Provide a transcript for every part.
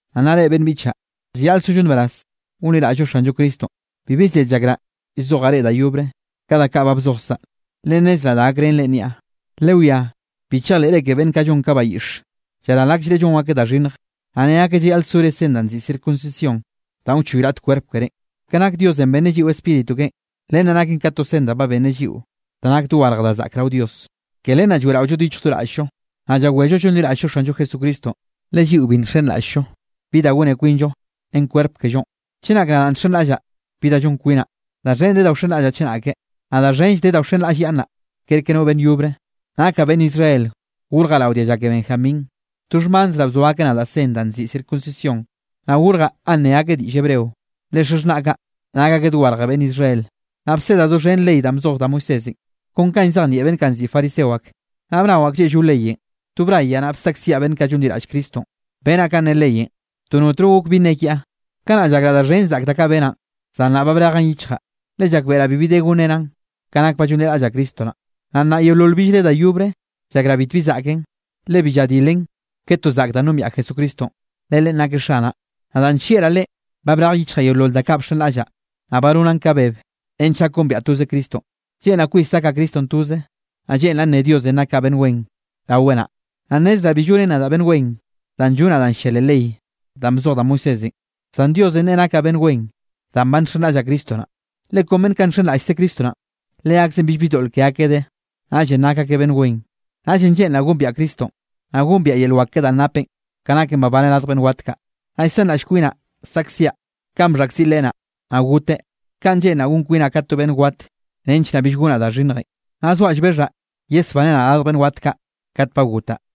Naꞌ nnaꞌ reꞌ beꞌnn biꞌchaꞌ, llayaꞌl sollo nbaraz gonliraꞌll-llo Xanllo Cristonꞌ, bibi zed llakraꞌ llzojaꞌ reꞌ da yobre, ka da kaꞌ ba bzojkzaꞌ, le nnezraꞌ da gakrén reꞌn niaꞌ. Lewiá, bi chejleꞌre ke beꞌnn kaꞌ llon ka bayiꞌxe, llaral akllreꞌ llon akeꞌ da xhinnj, naꞌ ne akeꞌ llayaꞌl sore sen danꞌ nziꞌi circuncisión danꞌ wchoy raꞌt kwerp kerénꞌ. Ke nak Diosenꞌ benneꞌ lliꞌo Spíritu keꞌen. Len naken ka to sen da ba benneꞌ lliꞌo da nak dogarje da zaꞌk rao Dios. Ke len naꞌ lloeꞌraolloeꞌ do yichj do raꞌll-llo, naꞌ llawello llonliraꞌll-llo Xanllo Jesucristonꞌ, le lliꞌo bi nxenraꞌll-llo bi da gone kwinllo ren kwerp kellonꞌ. Chenak nadaꞌ nxenraꞌllaꞌ bi da llon kwinaꞌ, da xhen de da wxenraꞌllaꞌ chenake. Naꞌ da xhenll de da wxenraꞌllyaꞌnnaꞌ kerke no beꞌnn yobre. Nakaꞌ beꞌnn Israel gorjaꞌ rao dialla ke Benjamín, to xhmanzraꞌ, bzo akeꞌ nadaꞌ sen danꞌ nziꞌi circuncisión. Naꞌ gorjaꞌ ganꞌ nne akeꞌ diꞌll hebreo, le xaxhnaꞌ kaꞌ nak akeꞌ dogarj beꞌnn Israel. Naꞌ bsedaꞌ doxhen ley danꞌ bzoj da Moisésenꞌ kon kanꞌ llzejnieꞌ beꞌnn kaꞌ nziꞌi fariseo ak. Naꞌ bnawaꞌ klleꞌllo leyenꞌ, to brayaꞌ, naꞌ bsaꞌkziaꞌ beꞌnn kaꞌ llonliraꞌll Cristonꞌ. Benaꞌ kanꞌ ne leyenꞌ to notno gok bi nne kiaꞌ. Kanaꞌ llakraꞌ da xhen zaꞌk da kaꞌ benaꞌn, zan nnaꞌ ba brejaꞌn yichjaꞌ, le llakbeꞌraꞌ bibi de gonrenaꞌn ka nak ba llonliraꞌllaꞌ Cristo naꞌ. Naꞌ nnaꞌ yeolol billre da yobre llakraꞌ bitbi zaꞌken, le bi lladilen ke ton zaꞌk danꞌ nombiaꞌ Jesucristonꞌ. Le Leꞌen nakeꞌ Xanaꞌ, naꞌ danꞌ nllieꞌraꞌ Leꞌen, ba brej yichjaꞌ yeolol da kaꞌ bxenraꞌllaꞌ, naꞌ ba nonaꞌn ka beb nench gak gombiaꞌ toze Cristonꞌ. Lleꞌnraꞌ kwis gakaꞌ Cristonꞌ toze, naꞌ lleꞌnraꞌ nne Diosenꞌ nakaꞌ beꞌnn wen raweꞌ naꞌ. Naꞌ nnezraꞌ bi llonen nadaꞌ beꞌnn wen danꞌ llonaꞌ danꞌ llia leꞌ ley danꞌ bzoj da Moisésenꞌ, zan Diosenꞌ neꞌe nakaꞌ beꞌnn wen danꞌ ba nxenraꞌllaꞌ Cristo naꞌ. Le kon beꞌnn kaꞌ nxenraꞌllkze Cristo naꞌ, leakzeꞌn billbi doꞌl ke akeꞌ de, naꞌllenꞌ nak akeꞌ beꞌnn wen. Naꞌllenꞌ lleꞌnraꞌ gombiaꞌ Cristonꞌ, naꞌ gombiaꞌ yel wak keꞌe danꞌ napeꞌ, ka naken babaneꞌ radj beꞌnn wat kaꞌ, naꞌ llsanraꞌllaꞌ kwinaꞌ saꞌkziaꞌ kanꞌ bxhaꞌkziꞌ Leꞌe naꞌ, naꞌ goteꞌ. Kaꞌn lleꞌnraꞌ gon kwinaꞌ ka to beꞌnn wat, nench naꞌ bill gonaꞌ da xhinnjenꞌ. Naꞌ zoaꞌ llbexhaꞌ yesbaneꞌ nadaꞌ radj beꞌnn wat kaꞌ kat ba gotaꞌ.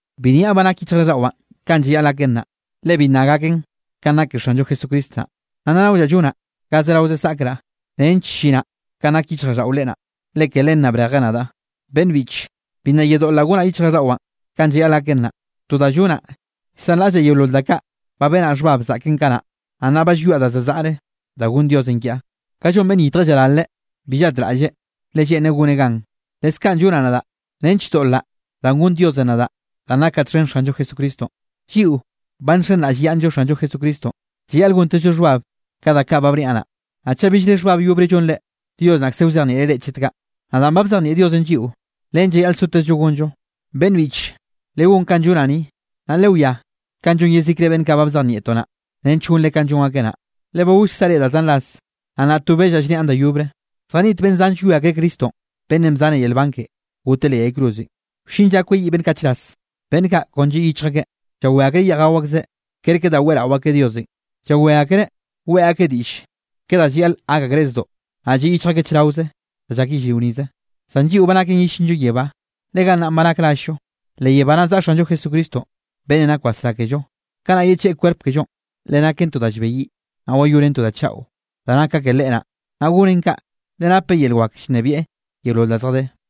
Bi nniaꞌ ba nak yichjraꞌlldaꞌwaꞌ kanꞌ llayaꞌl gaken naꞌ, le bi nna gaken kanꞌ nak ke Xanllo Jesucristo naꞌ. Naꞌ nnaꞌ naollaꞌ llonaꞌ ga zerao zaꞌkraꞌ nench llinaꞌ kanꞌ nak yichjraꞌlldaꞌo Leꞌe naꞌ, le ke len naꞌ brejeꞌ nadaꞌ. Beꞌnn biꞌche, bi nna yedoꞌlraꞌ gonaꞌ yichjraꞌlldaꞌwaꞌn kanꞌ llayaꞌl gaken naꞌ. To da llonaꞌ, llsanraꞌllaꞌ yeolol da kaꞌ ba benaꞌ xhbab zaꞌken kanaꞌ, naꞌ nnaꞌ ba llwiaꞌ da za zaꞌre, da gonn Diosenꞌ kiaꞌ. Ka llon beꞌnn llyitje llaralreꞌ, bi llatraꞌlleꞌ, le lleꞌnreꞌ goneꞌ gan, leskaꞌn llonaꞌ nadaꞌ nench doꞌlraꞌ danꞌ gonn Diosenꞌ nadaꞌ danꞌ nakaꞌ txhen Xanllo Jesucristonꞌ. Lliꞌo ba nxenraꞌllyaꞌnnllo Xanllo Jesucristonꞌ, llayaꞌl gontezllo xhbab ka da kaꞌ ba bniaꞌ naꞌ. Naꞌ chaꞌ billre xhbab yobre llonre, Dios naꞌkze wzejnieꞌreꞌ reꞌ chet kaꞌ. Naꞌ danꞌ ba bzejnieꞌ Diosenꞌ lliꞌo, len llayaꞌl sotezllo gonllonꞌ. Beꞌnn biꞌche, legón kanꞌ llonaꞌ ni, naꞌ lewiá kanꞌ llon yezikre beꞌnn kaꞌ ba bzejnieꞌtoꞌ naꞌ, nench gonre kanꞌ llon akeꞌ naꞌ. Le ba gollkzaꞌ reꞌ da zan ras, naꞌ nnaꞌ to bellaꞌ llniaꞌn da yobre, zjaniꞌt beꞌnn zan llwie akreꞌ Cristonꞌ beꞌnnenꞌ bzane yel nban keꞌe, goteꞌ leꞌ yay cruzenꞌ. Wllin lla kweyiꞌ beꞌnn kaꞌ chras, beꞌnn kaꞌ kon lliꞌ yichj akeꞌ, llawé akreꞌ yeꞌj gao akzeꞌ kerke da weꞌrao akeꞌ Diosenꞌ. Llawé akreꞌ weꞌe akeꞌ diꞌll ke da llayaꞌl gak akreꞌ zdoꞌ, naꞌ lliꞌ yichj akeꞌ chraoze da llak yellrio nize. Zan lliꞌo ba naken yellinllo yebá, le gannaꞌ ba nak rall-llo. Le yebá naꞌ zaꞌa Xanllo Jesucristonꞌ, beꞌnnenꞌ nak wasrá kello. Kanaꞌ yecheꞌe kwerp kellonꞌ, le naken to da llbeyiꞌ, naꞌ wayoneꞌn to da chaꞌo, da nak ka ke Leꞌe naꞌ. Naꞌ goneꞌn kaꞌ, le napeꞌ yel wak llnebieꞌ yeolol da zjadé.